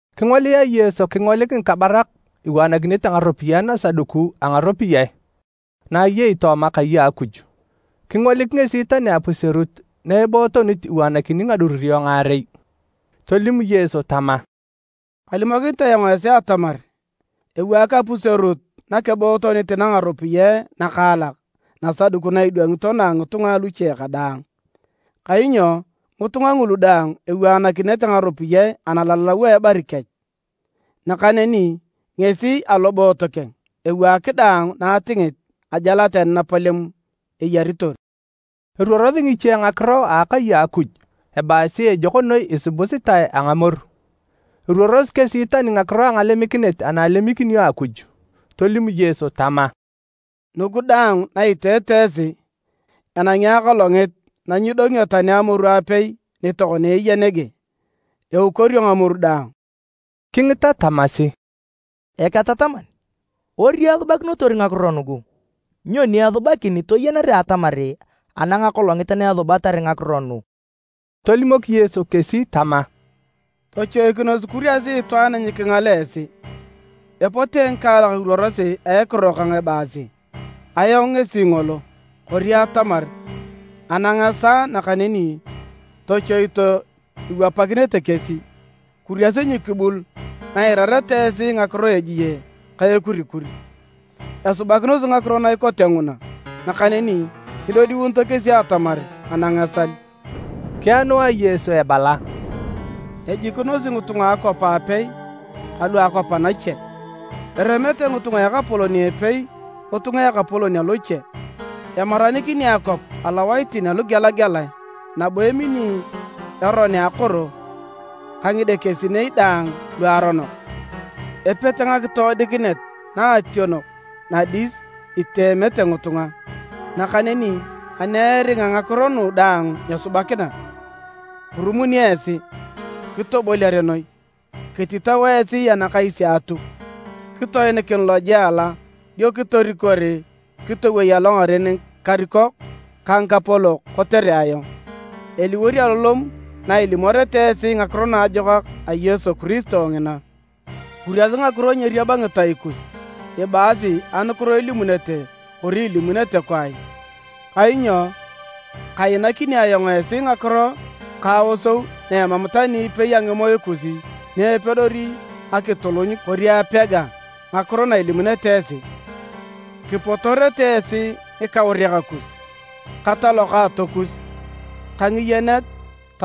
Kingolia Yesu kingolik ngikabarak iwaanakinete ngaropiyae nasaduku a ngaropiyae na ayei tooma akai a Akuj. Kingolik ngesi tani apuserut na ebootonit iwaakini ngadururio ngaarei. Tolim Yesu tama, “Kalimokinit ayong esi atamar ewaak apuserut nakebootonit na ngaropiyae nakaalak nasaduku na idwangito na a ngitunga aluche kadaang. Kainyo ngitunga ngulu daang ewaanakinete ngaropiyae analalau a ebari kech. Nakaneni ngesi aloboot keng, ewaak daang na atingit ajal tani napalem eyaritor.” Eruorosi ngiche ngakiro a akai a Akuj ebaasi ejok noi isubusitae a ngamoru. Eruorosi kesi tani ngakiro a ngalemikinet ana alemikinio Akuj. Tolim Yesu tama, “Nugu daang na iteete esi, enangi akolongit na nyidongio tani amoru apei ni tokona eya nege, eukorio ngamoru daang.” Kingita tamasi, “Eketataman, ori esubakinotor ngakiro nugu? Nyoni esubakin toyenere atamar anang akolongit na esubatar ngakiro nu?” Tolimok Yesu kesi tama, “Tochoikinos kuriasi itwaan nyikingala esi. Epote ngikaalak iruorosi a ekiro kang ebaasi, ‘Ayong ngesi ngolo!’ Kori atamar, ‘Anang esaa!’ Nakaneni tochoito iwapakinete kesi. Kuriasi nyikibul na iirareta esi ngakiro a ejie ka ekurikur, esubakinosi ngakiro na ikote nguna, nakaneni nyidodiunito kesi atamar anang esal.” Kianua Yesu ebala, “Ejikinosi ngitunga a akwap aapei ka lua akwap anache. Eremete ngitunga a ekapolon a epei ngitunga a ekapolon aloche. Emaranikini akwap alowaitin alugelagelae nabo emini eron a akoro ka ngidekesinei daang luaronok, epete ngakitoodikinet naationok nadis iteemete ngitunga. Nakaneni ani eringa ngakiro nugu daang nyesubakina, kirumunio esi, kitoboliare noi, kititao esi anakais a Atuk, kitoinikin lojela dio kitorikor kitowei alongaren ngikarikok ka ngikapolok kotere ayong. Eliwor alolom na ilimoreta esi Ngakiro Naajokak a Yesu Kiristo ngina. Kuriasi ngakiro nyeeriab ngitai kus ibaasi anukiro ilimunete kori ilimunete kwaai, kainyo kainakini ayong esi ngakiro ka aosou na emam tani ipei a ngimoe kus ni epedori akituluny kori apega ngakiro na ilimunete esi. Kipotorete esi ngikauriak kus, ka talokaato kus ka ngiyenet ka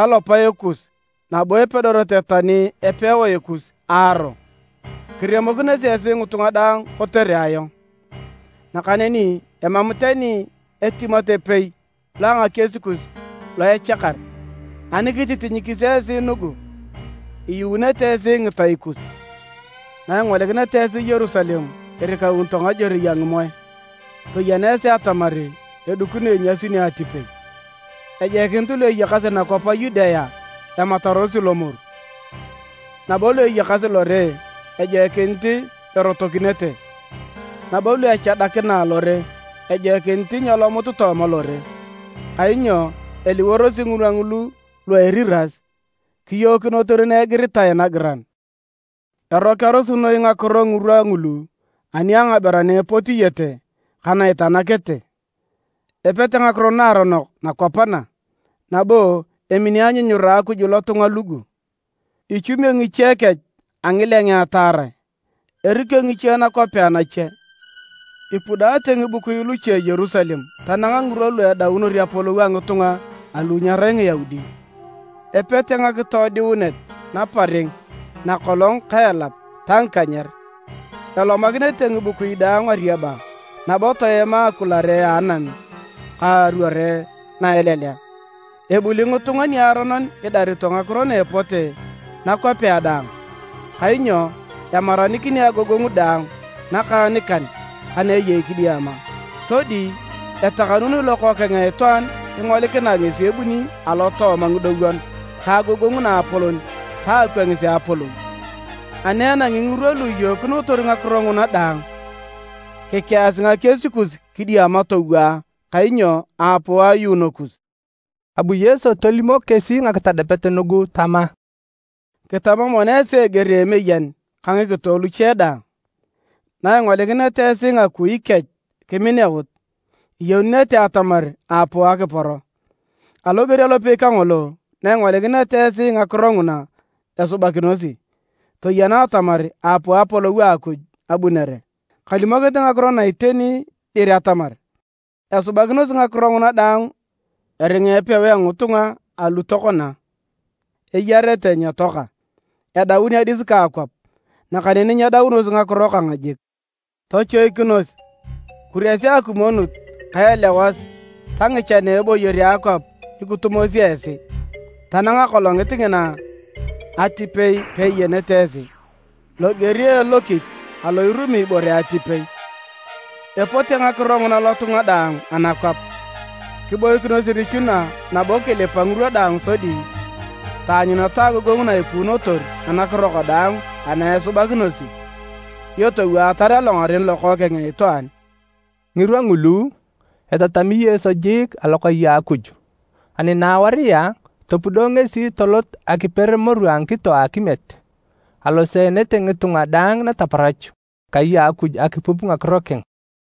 talopae kus nabo epedorete tani epewae kus aaro. Kiremokinosi esi ngitunga daang kotere ayong. Nakaneni emam tani etimat epei lo a ngakies kus lo echakar. Ani kititinyikis esi nugu, iyuunete esi ngitai kus. “Naingolikineta esi Yerusalem irikaunito ngajorei a ngimoe, toyena esi atamar edikino inyasunio atipei. Ejoikinit lu eyakasi nakwap a Yudea ematarosi lomoru, nabo lu eyakasi lore ejoikinit erotokinete, nabo lu echadakina alore, ejoikinit nyeelomut tooma lore. Kainyo eliworosi ngirwa ngulu ‘Lu a Eriras,’ kiyookinotor na igiritae nagiran. Erokearosi noi ngakiro ngirwa ngulu ani a ngaberu ana epotiete ka na itanakete! Epete ngakiro naaronok nakwap na, nabo emini anyunyura a Akuj lotunga lugu! Ichumio ngiche kech a ngilengea taarae, erikio ngiche nakwapea nache, ipudaate ngibukui luche Yerusalem tanang ngirwa lu edaunor apolou a ngitunga alu nyerai Ngiyaudi. “Epete ngakitoodiunet naparing nakolong ka elap ta ngikanyer. Elomakinete ngibukui daang ariaba nabo toema akulare a anam ka aruore na elelea. Ebuli ngitunga niaronon idarito ngakiro na epote nakwapea daang, kainyo emaranikini agogongu daang nakaanikan ka na eyei kidiama. Sodi etakanuni Lokookeng a Itwaan kingolikinae ngesi ebunit alotooma ngidowon ka agogongu naapolon ta akwangis a apolou. Ani enangi ngirwa lu iyookinotor ngakiro nguna daang, kikeasi ngakies kus kidiama towaa, kainyo aapuu ayuuno kus.” Abu Yesu tolimok kesi ngakitadapet nugu tama: “Kitama mono esi eger a emeyen ka ngikito luche daang. Na ingolikineta esi ngakui kech kimineut, iyenunete atamar aapuu akiporo. Aloger alopei kangolo, na ingolikineta esi ngakiro nguna esubakinosi, toyena atamar aapuu Apolou a Akuj abunere. “Kalimokinit ngakiro na iteni dir atamar esubakinosi ngakiro nguna daang eringa epewae a ngitunga alu tokona eyarete nyetoaka. Edaun adis ka akwap nakaneni nyedaunosi ngakiro kang jik. “Tochoikinos! Kuriasi akimwonut ka elewas ta ngichan a eboyor a akwap nyikitumosi esi, tanang akolongit ngina atipei peiyenete esi, loger a elokit alo irumi ibore atipei. Epote ngakiro nguna lotunga daang anakwap. Kiboikinos irichuna nabo kilipa ngirwa daang sodi taanyuneta agogongu na ipuunotor anakiro kadaang ana esubakinosi, dio towaatar alongaren Lokookeng a Itwaan.” Ngirwa ngulu, etatami Yesu jiik alokai a Akuj, ani naewaria topudo ngesi tolot akiper moru a ngikito a akimiet. Aloseenete ngitunga daang nataparach kai a Akuj akipup ngakiro keng.